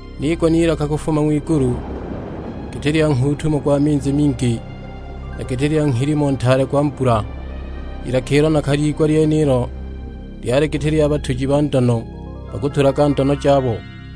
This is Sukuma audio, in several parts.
Niigwa n'ilaka kufuma ng'wigulu, giti lya nghuutumo gwa minzi mingi, na giti lya nghilimo ntaale gwa mbula. I lilaka ilo nakaliigwa lyenilo lyali giti lya batuji ba ndono bakutulaga ndono jabo.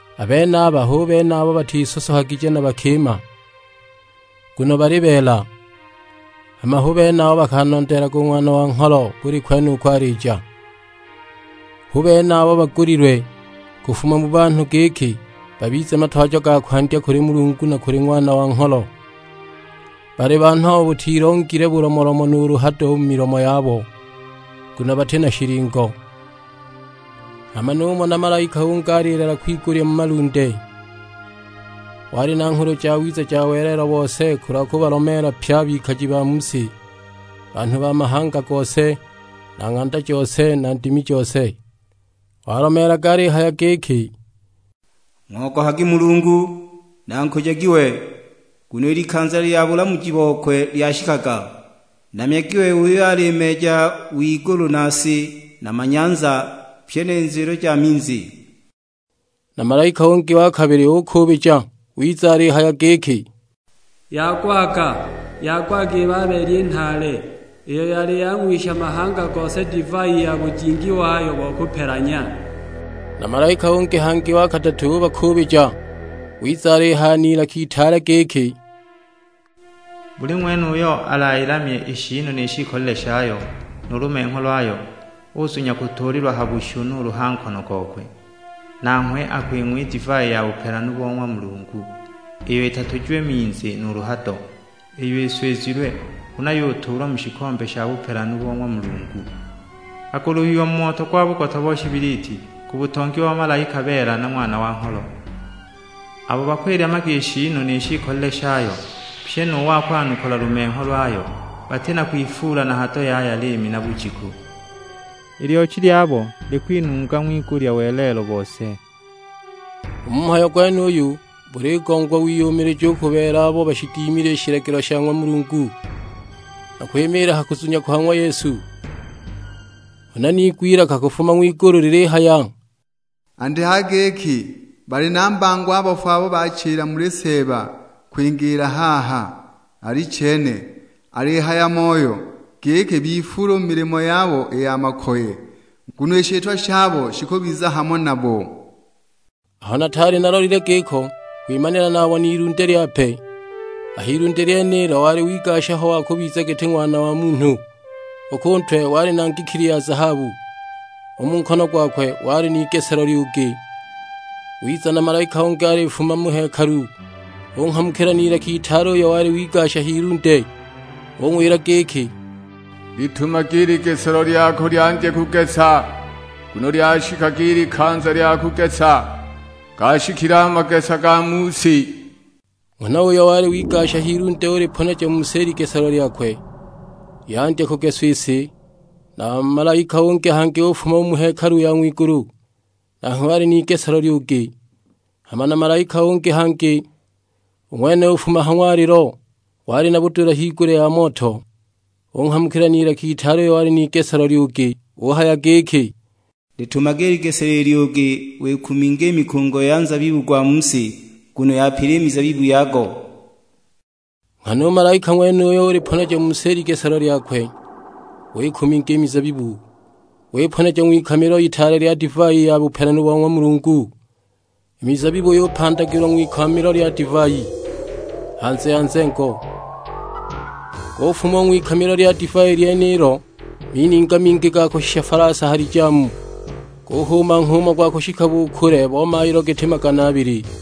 A benaba hu bene abo batisosohagije na bakima, nguno bali beela; hama hu bene abo bakanondeelaga u Ng'wana wa Ngholo buli kwene uko alija. Hu bene abo bagulilwe kufuma mu banhu giki babize matwajo ga kwandya kuli Mulungu na kuli Ng'wana wa Ngholo. Bali banhu abo butilongile bulomolomo nuulu hado u mu milomo yabo; nguno bati na shilingo. Hama numona malaika ungi alilala kwigulya mu malunde; wali na Nghulu Jawiza ja welelo bose kulwa kubalomeela pye a bikaji ba mu si; banhu ba mahanga gose, na ng'anda jose, na ndimi jose. Walomeelaga alihaya giki, "Ng'ogohagi Mulungu, na nkujagi we; nguno i likanza lya bulamuji bokwe lyashikaga. Namyagi we uyo ali meeja w'igulu na si na manyanza, pyi ni nzwilo ja minzi." Na malaika ungi wa kabili ukuubija; wiza alihaya giki, "Yagwaga, yagwaga i Babeli i nhaale, iyo yali yang'wisha mahanga gose divai ya bujingi wayo bo kupelanya!" Na malaika ungi hangi, wa kadatu; ubakuubija, wiza alihaya n'ilaka itaale giki, "Buli ng'wene uyo alayilamye i shiinu ni shiikolile shayo; nu lumengho lwayo uzunya kutuulilwa ha bushu nuulu ha nkono gokwe, nanghwe akwing'wa i divai ya bupelanu bo ng'wa Mulungu, iyo itatujiwe minzi nuulu hado; iyo iswizilwe huna yutuulwa mu shikombe sha bupelanu bo ng'wa Mulungu! Akuluhiwa mu moto gwa bugota bo shibiliti, ku butongi bo bamalaika beela na Ng'wana wa Ngholo. Abo bakwilamyaga i shiinu ni shiikolile shayo, pyi nu wa kwanukula lumengho lwayo, bati na kwifuula na hado yaya liimi na bujiku; i lyochi lyabo likwinunga ng'wigulya welelo bose! U mu mhayo gwenuyu buligongwa wiyumilija u ku beela abo bashidimile i shilagilo sha ng'wa Mulungu, na kwimiila ha kuzunya kwa ng'wa Yesu." Huna niigwa ilaka kufuma ng'wigulu lilihaya, "Andikaga giki, 'Bali na mbango a bafu abo balichila muli Seeba kwingiila haha: Alichene, alihaya Moyo; giki bifuule u mu milimo yabo i ya makoye, nguno i shitwa shabo shikubiza hamo nabo!' " Aho nataali nalolile giko kwimanila nabona ilunde lyape; a h'ilunde lyenilo wali wigasha ho wa kubiza giti Ng'wana wa Munhu. U ku ntwe wali na ngikili ya zahabu, u mu nkono gwakwe wali n'igeselo lyugi. Wiza na malaika ungi alifuma mu hekalu, unghamukila n'ilaka itaale uyo wali wigasha h'ilunde; ung'wila giki, "Litumage i ligeselo lyako lyandye kugesa, nguno lyashikaga i likanza lya kugesa, gaashikile a magesa ga mu si." Nghana uyo wali wigasha h'ilunde uliponeja mu si i ligeselo lyakwe, yandya kugeswa i si! Na malaika ungi hangi ufuma u mu hekalu ya ng'wigulu, nanghwe wali n'igeselo lyugi. Hama na malaika ungi hangi, u ng'wene ufuma ha ng'walilo, wali na budula higulya ya moto, unghamukila n'ilaka itaale uyo wali n'igeselo lyugi; uhaya giki, "Litumage i ligeselo i lyugi wikuminge i mikungo ya nzabibu gwa mu si, nguno yapile i mizabibu yago." Nghana u malaika ng'wenuyo uliponeja mu si i ligeselo lyakwe, wikuminga i mizabibu, wiponeja ng'wikamilo itaale lya divai ya bupelanu bo ng'wa Mulungu. I mizabibu yupandagilwa ng'wikamilo lya divai, hanze ya nzengo. Gufuma u ng'wikamilo lya divai lyenilo mininga mingi ga kushisha falasa ha lijamu, guhuuma nghuumo gwa kushika bu kule bo mailo giti magana abili.